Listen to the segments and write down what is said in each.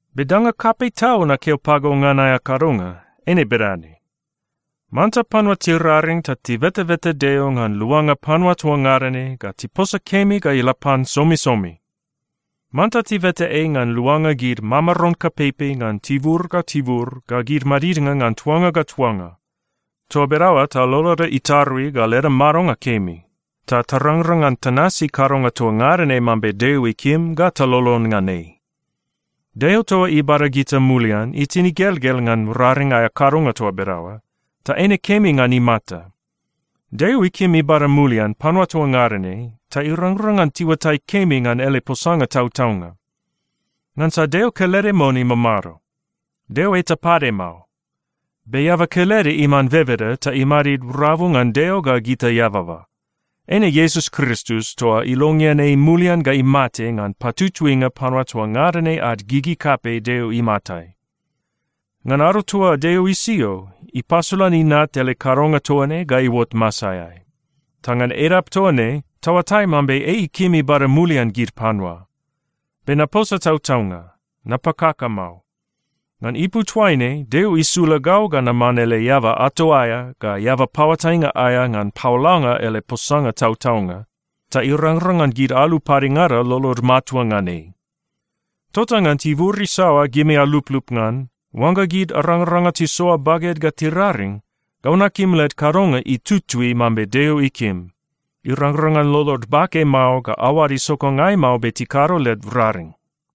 Be danga kapei tau nakeo pago ngan aea kadonga, eine bedane: Manta panua tiraring ta tibetabeta Deo ngan luanga panua toa ngada ne ga tiposa kemi ga ila pan somisomi. Manta tibeta ei ngan luanga gid mamaron kapeipei ngan tibur ga tibur ga gid madidnga ngan tuanga ga tuanga. Toa bedaoa ta loloda itarui ga leda madonga kemi, ta tarangrang ngan tanasi kadonga toa ngada ne mambe Deo ikim ga talolon ngan ei. Deo toa ibada gita mulian itin igelgel ngan raring aea kadonga toa bedaoa, ta eine kemi ngan imata. Deo ikim ibada mulian panua toa ngada ne ta irangrang ngan tiuatai kemi ngan ele posanga tautaunga. Ngansa Deo kelede mon imamado. Deo eta pade mao. Be eaba kelede iman bebeda ta imadid rabu ngan Deo ga gita eababa, eine Iesus Kristus toa ilongean ei mulian ga imate ngan patutuinga panua toa ngada ne ad gigi kapei Deo imatai. Ngan ado toa Deo isio, ipasolan Inat ele kadonga toa ne ga iuot masaeai, ta ngan edap toa ne taoatai mambe ei ikim ibada mulian gid panua. Be naposa tautaunga. Napakaka mao. Ngan ipu toaine Deo isula gau ga naman ele eaba ato aea ga eaba paoatainga aea ngan paolanga ele posanga tautaunga, ta irangrang ngan gid alu padengada lolod matua ngan ei. Tota ngan tibur isaoa gimi aluplup ngan, oangga gid arangaranga tisoa baged ga tiraring, gau nakim led kadonga itutui mambe Deo ikim. Irangrang ngan lolod bake mao ga aoad isokangai mao be tikado led raring.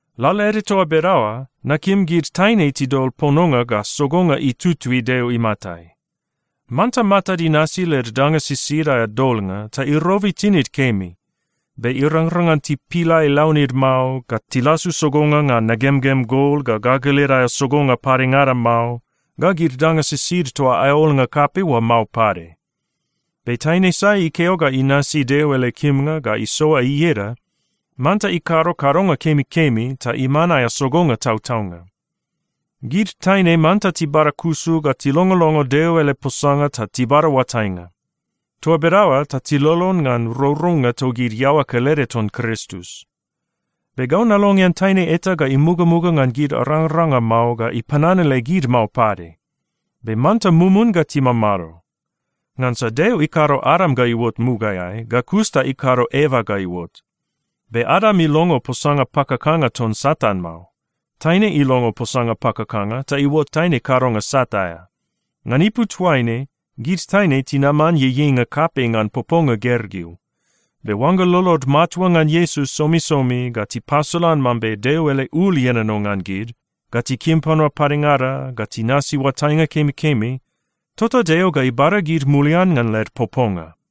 Lalaede toa bedaoa, nakim gid taine tidol pononga ga sogonga itutui Deo imatai. Manta matad inasi led danga sisid aea dolnga ta irobi tinid kemi. Be irangrang ngan tipilai launid mao, ga tilasu sogonga ngan nagemgem gol ga gagalid aea sogonga padengada mao, ga gid danga sisid toa aea olnga kapei oa mao pade. Be taine sai ikeo ga inasi Deo ele kimnga ga isoa ieda, manta ikado kadonga kemikemi ta iman aea sogonga tautaunga. Gid taine manta tibadakusu ga tilongolongo Deo ele posanga ta tibada oatainga. Toa bedaoa ta tilolon ngan rourounga togid iaoa kelede ton Kristus. Be gau nalongean taine eta ga imugamuga ngan gid arangaranga mao ga ipananale gid mao pade. Be manta mumun ga timamado. Ngansa Deo ikado Adam ga iuot mugaeai, ga kus ta ikado Eva ga iuot. Be Adam ilongo posanga pakakanga ton Satan mao. Taine ilongo posanga pakakanga ta iuot taine kadonga sat aea. Ngan ipu toaine, gid taine tinaman ieieinga kapei ngan poponga gergeu. Be oangga lolod matua ngan Iesus somisomi, ga tipasolan mambe Deo ele ul ienono ngan gid, ga tikim panua padengada, ga tinasi oatainga kemikemi, tota Deo ga ibada gid mulian ngan led poponga.